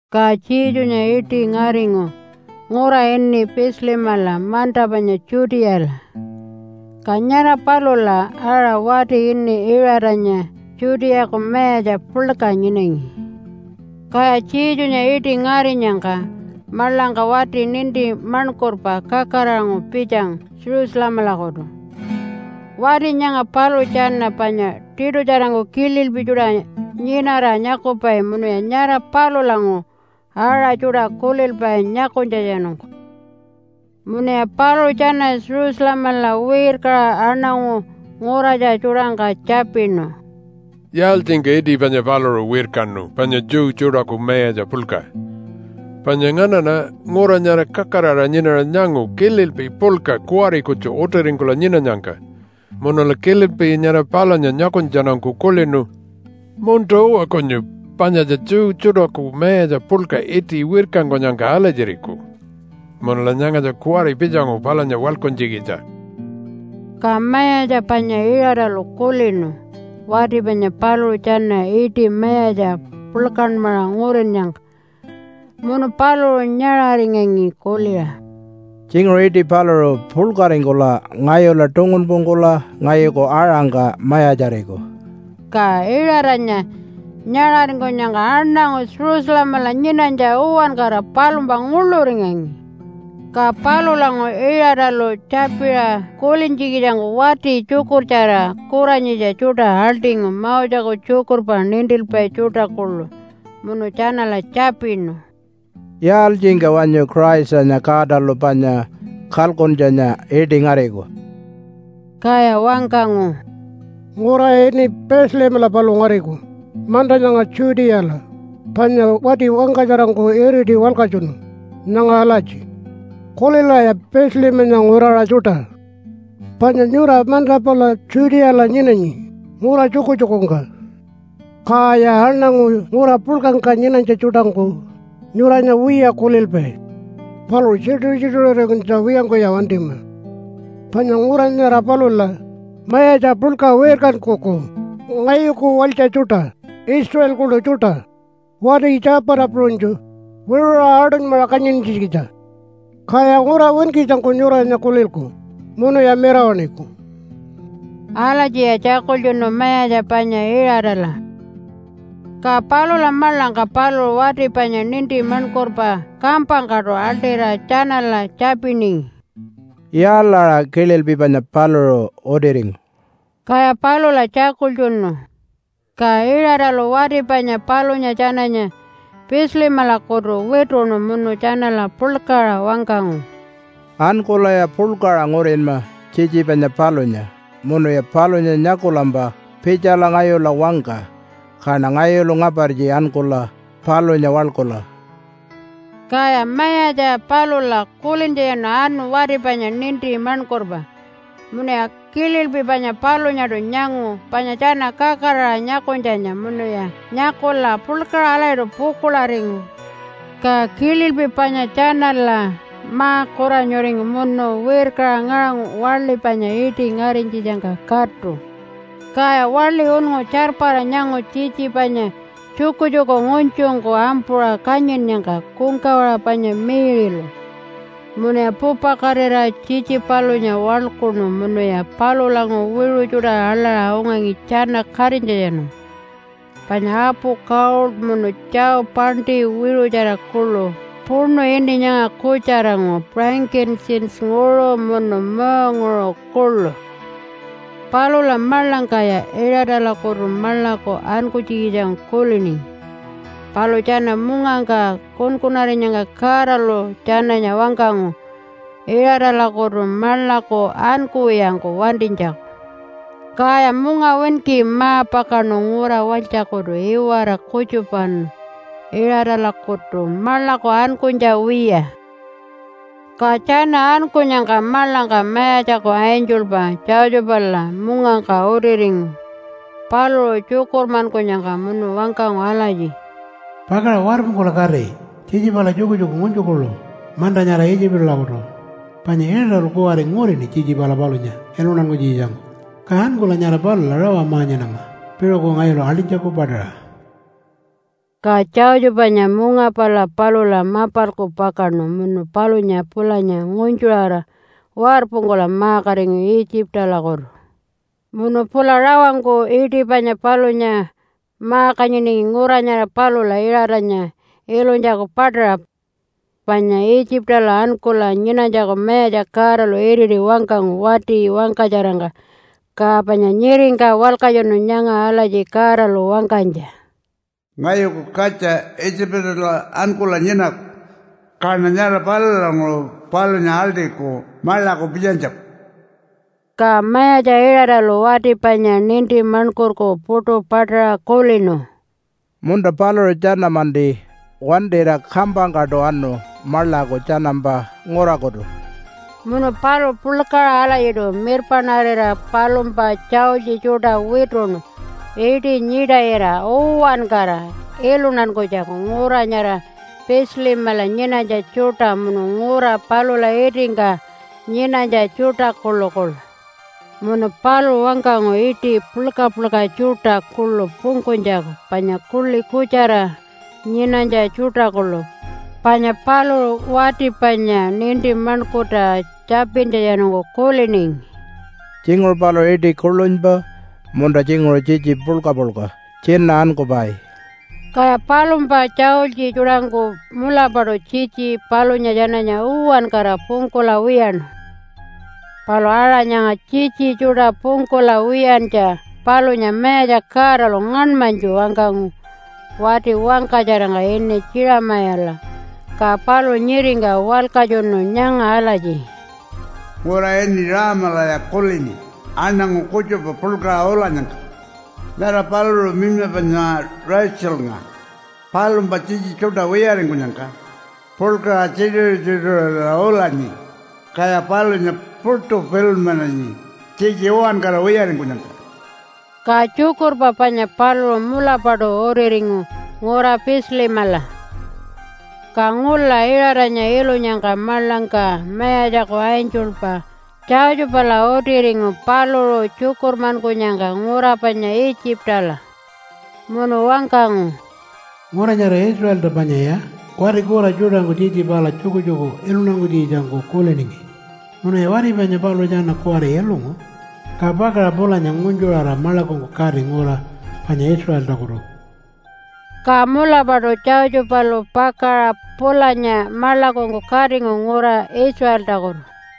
Ka Jesunya iṯi ngaringu ngura ini Bethlehemala manta panya Judeala, ka nyara palula aṟa wati ini Iṟatanya Judeaku mayatja puḻka nyinangi. Kaya Jesunya iṯi ngarinyangka maḻangka wati ninti maṉkurpa kakaraṟanguṟu pitjangu Jerusalemalakutu. Wati nyanga paluṟu tjana panya tiṯutjarangku kililpi tjuṯa nyinara nyakupai munuya nyara palulanguṟu aṟa tjuṯa kulilpai nyakunytjatjanungku. Munuya paluṟu tjana Jerusalemala wirkaṟa aṉangu nguratja tjuṯangka tjapinu, “Yaaltjingka iṯi panya paluṟu wirkanu, panya Jew tjuṯaku mayatja puḻka? Panya nganaṉa ngura nyara kakaraṟa nyinara nyangu kililpi puḻka kuwari kutju utiringkula nyinanyangka munula kililpi nyara palunya nyakunytjatjanungku kulinu, ‘Munta-uwa kunyu panyatja Jew tjuṯaku mayatja puḻka iṯi wirkankunyangka alatjiriku.’ Munula nyangatja kuwari pitjangu palunya waḻkuntjikitja.” Ka mayatja panya Iṟatalu kulinu wati panya paluṟu tjana iṯi mayatja puḻkanmaṟa ngurinnyangka, munu paluṟu nyaṟaringangi kuliṟa, “Tjinguṟu iṯi paluṟu puḻkaringkula ngayula tungunpungkula ngayuku aṟangka mayatjariku.” Ka Iṟatanya nyaṟaringkunyangka aṉangu Jerusalemala nyinanytja uwankara palumpa nguḻuringangi. Ka palulanguṟu Iṟatalu tjapiṟa kulintjikitjangku wati tjukurtjara kuranyitja tjuṯa aḻṯingu Moseku tjukurpa nintilpai tjuṯa kuḻu, munu tjanala tjapinu, “Yaaltjingka wanyu Christanya Godalu panya kalkuntjanya iṯi ngariku?” Kaya wangkangu, “Ngura ini Bethlehemala paluṟu ngariku manta nyanga Judeala, panya wati wangkatjarangku iriṯi walkatjunu nyanga alatji, ‘Kulilaya Bethlehemanya nguraṟa tjuṯa! Panya nyura manta pala Judeala nyinanyi ngura tjukutjukungka, kaya aṉangu ngura puḻkangka nyinanytja tjuṯangku nyuranya wiya kulilpai. Palu tjituṟu-tjituṟurinytja wiyangkuya wantima, panya ngura nyara palula mayatja puḻka wirkankuku ngayuku walytja tjuṯa Israelkunu tjuṯa wati tjapata puṟunytju wiṟuṟa aṯunymaṟa kanyintjikitja, kaya ngura winkitjangku nyuranya kulilku munuya mirawaṉiku.’” Alatjiya tjakultjunu Mayatja panya Iṟatala. Ka palula maḻangka paluṟu wati panya ninti maṉkurpa kampangkaṯu aḻṯira tjanala tjapiningi, “Yaalaṟa kililpi panya paluṟu utiringu?” Kaya palula tjakultjunu. Ka Iṟatalu wati panya palunya tjananya Bethlehemalakutu wituṉu munu tjanala puḻkaṟa wangkangu, “Ankulaya puḻkaṟa ngurinma tjitji panya palunya munuya palunya nyakulampa pitjala ngayula wangka kaṉa ngayulu ngapartji ankula palunya waḻkula.” Kaya mayatja palula kulintjatjanu anu wati panya ninti maṉkurpa. Munuya kililpi panya palunyaṯu nyangu panya tjana kakaraṟa nyakunytjanya munuya nyakula puḻkaṟa alatjiṯu pukuḻaringu. Ka kililpi panya tjanala ma-kuranyuringu munu wirkaṟa ngaṟangu waḻi panya iṯi ngarinytjitjangka katu. Kaya waḻi unngu tjarpara nyangu tjitji panya tjukutjuku ngunytjungku ampuṟa kanyinnyangka kungkawaṟa panya Mary-lu. Munuya pupakatira tjitji palunya waḻkuṉu munuya palulanguṟu wiṟu tjuṯa aḻaṟa ungangi tjana katinytjatjanungku, panya apu gold, munu tjau paṉṯi wiṟutjara kuḻu puṉu ini nyanga kutjaranguṟu frankincense-nguṟu munu muunguṟu kuḻu. Palula maḻangkaya Iṟatalakutu maḻaku ankunytjikitjangku kuliningi, palu tjana mungangka kunkunarinyangka Godalu tjananya wangkangu Iṟatalakutu maḻaku ankuwiyangku wantinytjaku. Kaya mungawinki ma-pakaṉu ngura walytjakutu iwara kutjupawanu Iṟatalakutu maḻaku ankunytja wiya. Ka tjana ankunyangka maḻangka Mayatjaku angelpa Josephala mungangka utiringu paluṟu tjukurmankunyangka munu wangkangu alatji, “Pakaṟa warpungkula kati tjitji pala tjukutjuku ngunytju kuḻu manta nyara Itjipalakutu, panya Iṟatalu kuwari ngurini tjitji pala palunya iluntankunytjikitjangku. Ka ankula nyara palula rawa ma-nyinama piṟuku ngayulu aḻṯinytjaku paṯaṟa.” Ka Josephanya munga pala palula mapalku pakaṉu munu palunya pulanya ngunytjuṟara warpungkula ma-katingu Itjipalakutu. Munu pula rawangku iṯi panya palunya ma-kanyiningi ngura nyara palula Iṟatanya ilunytjaku paṯaṟa. Panya Itjipala ankula nyinanytjaku Mayatja Godalu iriti wangkangu wati wangkatjarangka, ka panya nyiringka walkatjunu nyanga alatji Godalu wangkanytja, “Ngayuku katja Itjipala ankula nyinaku, kaṉa nyara palulanguṟu palunya aḻṯiku maḻaku pitjanytjaku.” Ka mayatja Iṟatalu wati panya ninti maṉkurku puṯu paṯaṟa kulinu, “Munta, paluṟu tjana-manti wantira kampangkaṯu anu maḻaku tjanampa ngurakutu.” Munu paluṟu puḻkaṟa alatjiṯu mirpaṉarira palumpa tjaultji tjuṯa wituṉu iṯi nyiṯayira uwankara iluntankunytjaku ngura nyara Bethlehemala nyinanytja tjuṯa munu ngura palula itingka nyinanytja tjuṯa kuḻukuḻu. Munu paluṟu wangkangu iṯi puḻka-puḻka tjuṯa kuḻu pungkunytjaku panya kuḻi kutjara nyinanytja tjuṯa kuḻu. Panya paluṟu wati panya ninti maṉkurta tjapintjatjanungku kuliningi, “Tjinguṟu paluṟu iṯi kuḻunypa, munta tjinguṟu tjitji puḻka-puḻka tjina ankupai.” Kaya palumpa tjaultji tjuṯangku mulapaṯu tjitji palunya tjananya uwankara pungkula wiyaṉu. Palu aṟa nyanga tjitji tjuṯa pungkula wiyantja palunya Mayatja Godalu ngaṉmanytju wangkangu wati wangkatjarangka ini Jeremiah-la ka paluṟu nyiringka walkatjunu nyanga alatji, “Ngura ini Raamalaya kulini aṉangu kutjupa puḻkaṟa ulanyangka. Nyara paluṟu minyma panya Raitjilnga palumpa tjitji tjuṯa wiyaringkunyangka puḻkaṟa tjituṟu-tjituṟurira ulanyi, kaya palunya puṯu pilunmananyi tjitji uwankara wiyaringkunyangka.” Ka tjukurpa panya paluṟu mulapaṯu utiringu ngura Bethlehemala. Ka ngula Iṟatanya ilunyangka maḻangka Mayatjaku angelpa Josephala utiringu paluṟu tjukurmankunyangka ngura panya Itjipala. Munu wangkangu, “Ngura nyara Israelta panyaya wati kura tjuṯangku tjitji pala tjukutjuku iluntankunytjikitjangku kuliningi, munuya wati panya paluṟu tjana kuwari ilungu. Ka pakaṟa pulanya ngunytjuṟara maḻakungku kati ngura panya Israeltakutu!” Ka mulapaṯu Josephalu pakaṟa pulanya maḻakungku katingu ngura Israeltakutu.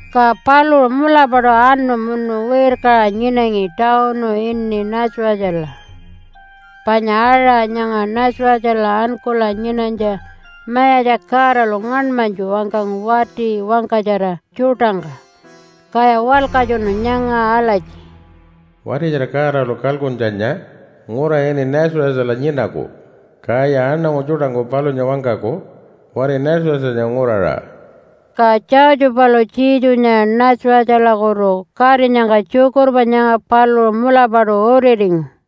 Ka paluṟu mulapaṯu anu munu wirkaṟa nyinangi tawunu ini Nazarethala. Panya aṟa nyanga Nazarethala ankula nyinanytja Mayatja Godalu ngaṉmanytju wangkangu wati wangkatjara tjuṯangka, kaya walkatjunu nyanga alatji, “Wati nyara Godalu kalkuntjanya ngura ini Nazarethala nyinaku, kaya aṉangu tjuṯangku palunya wangkaku wati Nazarethanya nguraṟa.” Ka Josephalu Jesunya Nazarethalakutu katinyangka tjukurpa nyanga paluṟu mulapaṯu utiringu.